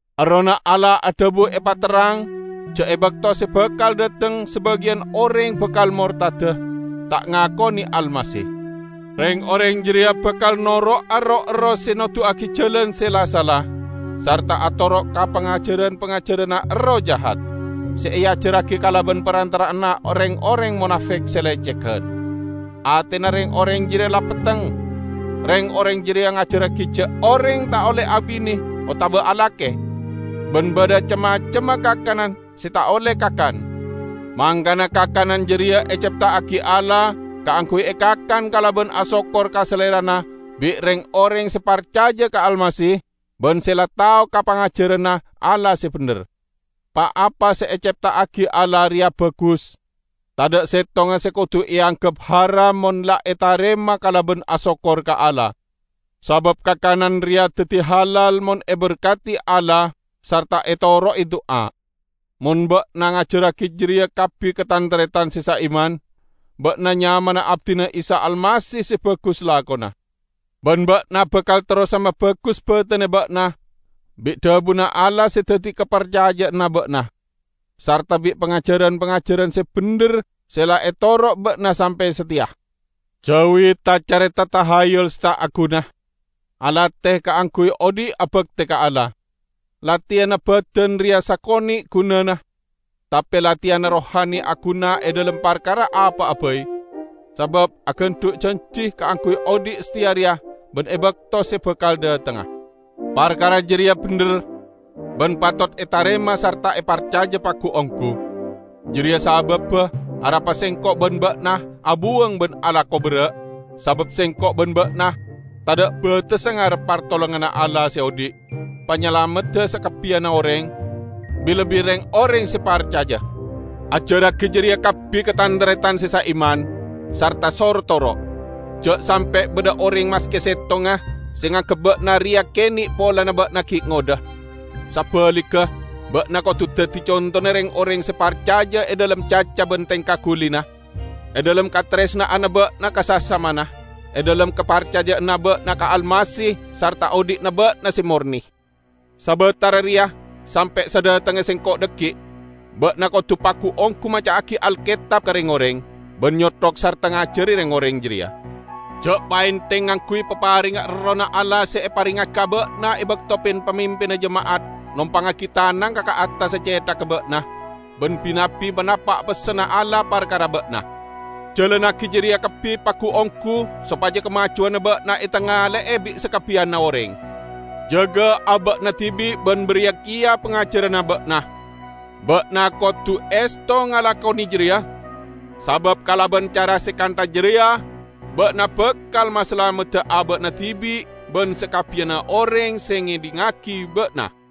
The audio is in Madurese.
Errohna Allah adhabu epaterrang ja' e bakto se bakal dhateng sabagiyan oreng bakal mortada, ta' ngakone Almasih. Reng-oreng jareya bakal noro'a roh-erroh se noduwagi jalan se la-sala, sarta atoro' ka pangajaran-pangajaranna erroh jahat, se eajarragi kalaban parantara'anna reng-oreng monafek se lecegan. Atena reng-oreng jareya la petteng. Reng-oreng jareya ngajarragi ja' oreng ta' olle abine otaba alake, ban badha cem-macemma kakanan se ta' olle kakan. Mangkana kakanan jareya ecepta'agi Allah kaangguy ekakan kalaban asokkor ka Salerana bi' reng-oreng se parcaja ka Almasih ban se la tao ka pangajaranna Allah se bendher. Pa-apa se ecepta'agi Allah reya bagus, tadha' settonga se kodu eanggep haram mon la etarema kalaban asokkor ka Allah. Sabab kakanan reya daddi halal mon eberkadi Allah sarta etoro'e du'a. Mon ba'na ngajarragi jareya kabbi ka tan-taretan se saiman, ba'na nyamana abdina Isa Almasih se bagus lakona. Ban ba'na bakal terrosa mabagus batenna ba'na bi' dhabuna Allah se daddi kaparcaja'anna ba'na, sarta bi' pangajaran-pangajaran se bendher se la etoro' ba'na sampe' sateya. Jauwi ta-careta tahayyul se ta' aguna. Alate kaangguy odhi' abakte ka Allah. Lateyanna badan reya sakone' gunana, tape lateyanna rohani aguna e dhalem parkara apa'a bai, sabab agandhu' janji kaangguy odhi' sateya reya ban e bakto se bakal dhatengnga. Parkara jareya bendher, ban patot etarema sarta eparcaja pagu-onggu. Jareya sababba arapa sengko' ban ba'na abuwang ban alako berra', sabab sengko' ban ba'na tadha' batessa ngarep partolonganna Allah se odhi', Panyalamedda sakabbiyanna oreng, bi-lebbi reng-oreng se parcaja. Ajarragi jareya kabbi ka tan-taretan se saiman, sarta soro toro'. Ja' sampe' badha oreng maske settonga se nganggep ba'na reya kene' polana ba'na gi' ngodha. Sabaligga ba'na kodu daddi contona reng-oreng se parcaja e dhalem caca ban tengka gulina, e dhalem kataresna'anna ba'na ka sasamana, e dhalem kaparcaja'anna ba'na ka Almasih sarta odhi'na ba'na se morne. Sabatara reya, sampe' sadhatengnga sengko' dhaggi', ba'na kodu pagu-onggu maca'agi Alketab ka reng-oreng, ban nyothok sarta ngajari reng-oreng jareya. Ja' paentheng ngangguy paparengnga Errohna Allah se eparengngagi ka ba'na e bakto pin-pamimpinna jema'at nompangngagi tanangnga ka attassa cethagga ba'na, ban bi-nabbi manapa' pessenna Allah parkara ba'na. Jalannagi jareya kabbi pagu-onggu sopaja kamajuwanna ba'na etangale'e bi' sakabbiyanna oreng. Jaga aba'na dibi' ban bariya keya pangajaranna ba'na. Ba'na kodu esto ngalakone jareya, sabab kalaban cara se kantha jareya ba'na bakal masalamedda aba'na dibi' ban sakabbiyanna oreng se ngedhingngagi ba'na.